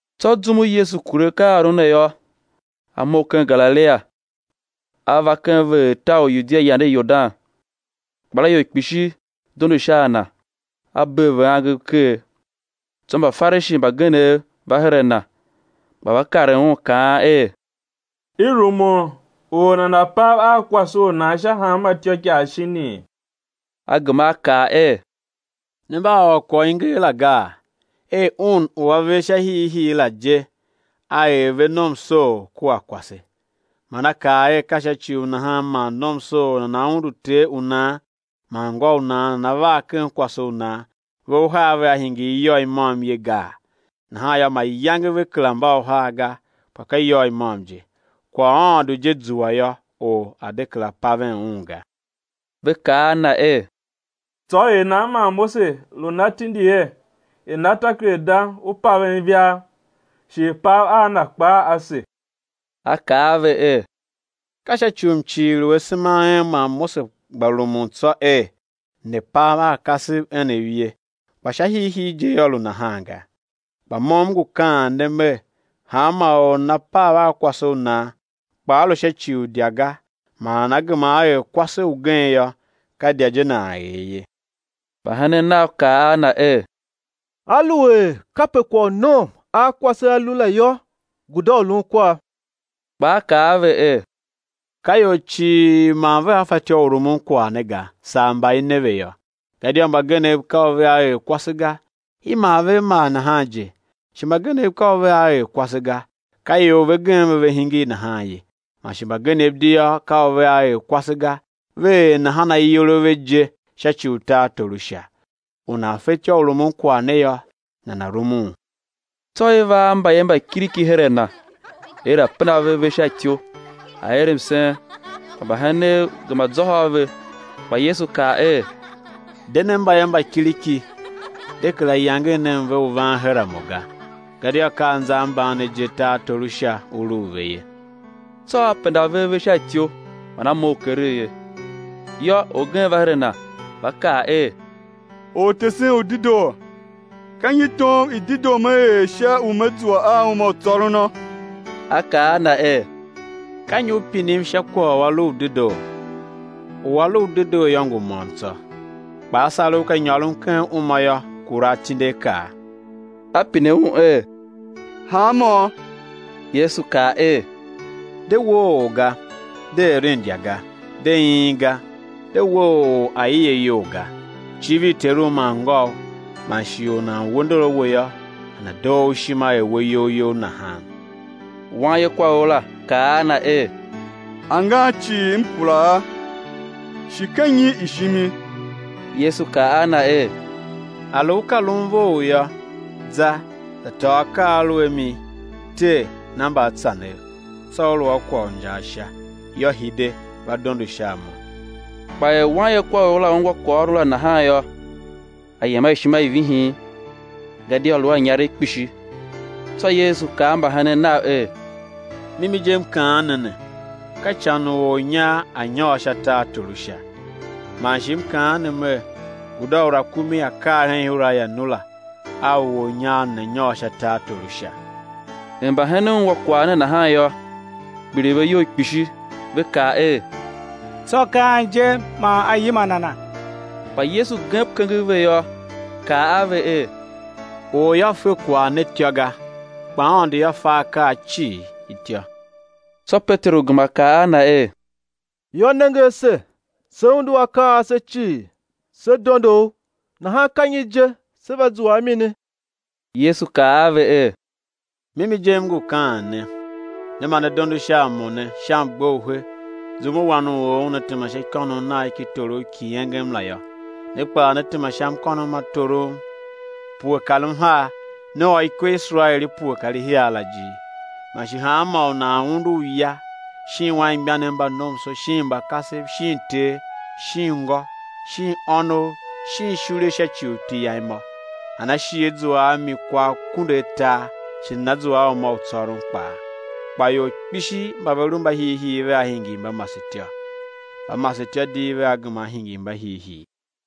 Tsô zum u Yesu kure akaaôron ne yô, A mough ken Galilia, A va ken veghertar u Yudia yande Yordan. Ikpelaior kpishi dondo sha a Na, A bee ve angev ker. Tsô Mbafarishi mbagenev va her a Na, gba va karen Un kaan er: I rumun u or nana̱ pav a kwase u nan sha hanma ityôikaa shinii? A gema A kaa er: Ne mba a ôr kwagh u i nger la gaa, er Un u A er ve sha hiihii la je, A er ve nomsoor kua kwase; man A kaa er: Ka sha ci u nahan man nomsoor nana undu ter u nan man ngô u nan, nana var ken kwase u nan, ve uhar vea hingir iyôgh i môm ye gaa? Nahan yô, mayange ve kera mba uhar ga, kpa ka iyôgh i môm je. Kwagh u Aôndo je zua yô, or a̱ de kera paven un ga. Ve kaa a Na er: Tsô er nan man Mose lu na tindi er i̱ na takerada u ivaa i paven, shi i̱ pav a na kpaa ase? A kaa a ve er: Ka sha ci u mcighir u asema a en man Mose gba rumun tsô er, ne̱ pav a kasev enev ye, kpa sha hiihii je yô, lu nahan ga. Kpa Mo M ngu kaan ne Mer: Hanma or u nana pav a kwase u nan, kpa a lu sha ci u idya ga man nana gema á er kwase ugen yô, ka idya je nan er ye. Mbahenen Nav kaa a Na er: Aluer kape kwagh u nom a kwase a lu la yô, guda u lun kwav. Kpa A kaa a ve er: Ka ior cii man vea fatyô u rumun kwagh ne ga, saa mba i ne ve yô. Gadia mbagenev ka u vea er kwase ga, i mar ve a mar nahan je; shi mbagenev ka u vea er kwase ga, ka ior ve gem ve ve hingir nahan ye; man shi mbagenev di yô, ka u vea er kwase ga, ve er nahan ayol a ve je sha ci u tartor u Sha. U nan fetyô u rumun kwagh ne yô, nana̱ rumun. Tsô i va a mbayev mba kiriki her a Na er A̱ penda ve ave sha ityou, A̱ er msen; kpa mbahenen gema zôhô a ve. Kpa Yesu kaa er: De nen mbayev mba kiriki, de kera yangen nen ve u van her a Mo ga, gadia ka anza a mban ne je tartor u Sha u lu u ve ye. Tsô A penda ve ave sha ityou man A mough keregh ye. Yô, orgen va her a Na va kaa er: Ortesen u dedoo, ka nyi tom i dedoo me er sha u me zua a uma u tsôrono? A kaa a na er: Ka nyi u pinim sha kwagh u a lu u dedoo? U A lu u dedoo yô, ngu môm tsô. Kpa á sar u ka nyôron ken uma yô, kura atindiakaa. A pine un er: Hanmô? Yesu kaa er: De woo or ga; de eren idya ga; de iin ga; de we or aie iyol ga; civir teru man ngôu; man shi: Or u nan we ndor a we yô, nana̱ doo u ishima er we iyol you nahan. Wanyekwaor la kaa a Na er: Angan cii, m kura a, shi ka nyi i shimi? Yesu kaa a na er: A lu u ka lun vough yô, za za tôô akaa a u lu a mi, tee, na mbaatsanev, tsô ú lu a kwagh u injaa Sha; yô, hide va dondo sha a Mo. Kpa er wanyekwaor la ungwa kwaghôron la nahan yô, a yem a ishima i vihin, gadia lu a inyaregh kpishi. Tsô Yesu kaa a mbahenen Nav er: Mimi je M kaan ne ne, ka ican u ornyar a̱ nyôr sha tartor u Sha. Man shi M kaan ne Mer: Guda u rakumi á kar ken ihura i anura, a u ornyar nana̱ nyôr sha tartor u Sha. Er mbahenen ungwa kwagh ne nahan yô, kpiligh ve iyol kpishi, ve kaa er: Tsô ka an je man á yima nana? Kpa Yesu gem kenger ve yô, kaa a ve er: Or yô, fe kwagh ne ityô ga, kpa Aôndo yô, fe akaa cii ityô. Tsô Peteru gema kaa a Na er: Yô, nenge ase, se undu akaa cii, se dondo U, nahan ka nyi je sé va zua a mini? Yesu kaa a ve er: Mimi je M ngu kaan ne, ne mba ne dondo sha a Mo ne, sha mgbe u he, zum u Wan u or Una tema sha ikônough Nagh ki torough ki engem la yô, ne kpaa, né tema sha mkônom ma torom pue kar mhar, ne ôr ikwe i Iserael i pue kar ihar la ijir. Man shi hanmô u nan undu uya shin anmgbianev mba nomso, shin mba kasev, shin ter, shin ngô, shin ônov, shin ishule sha ci u iti Yam yô, nana shi á zua a mi kwa akunduatar shi nana zua a uma u tsôron kpaa. Kpa ior kpishi mba ve lu mbahiihii vea hingir mbamasetyô, mbamasetyô di vea gema á hingir mbahiihii.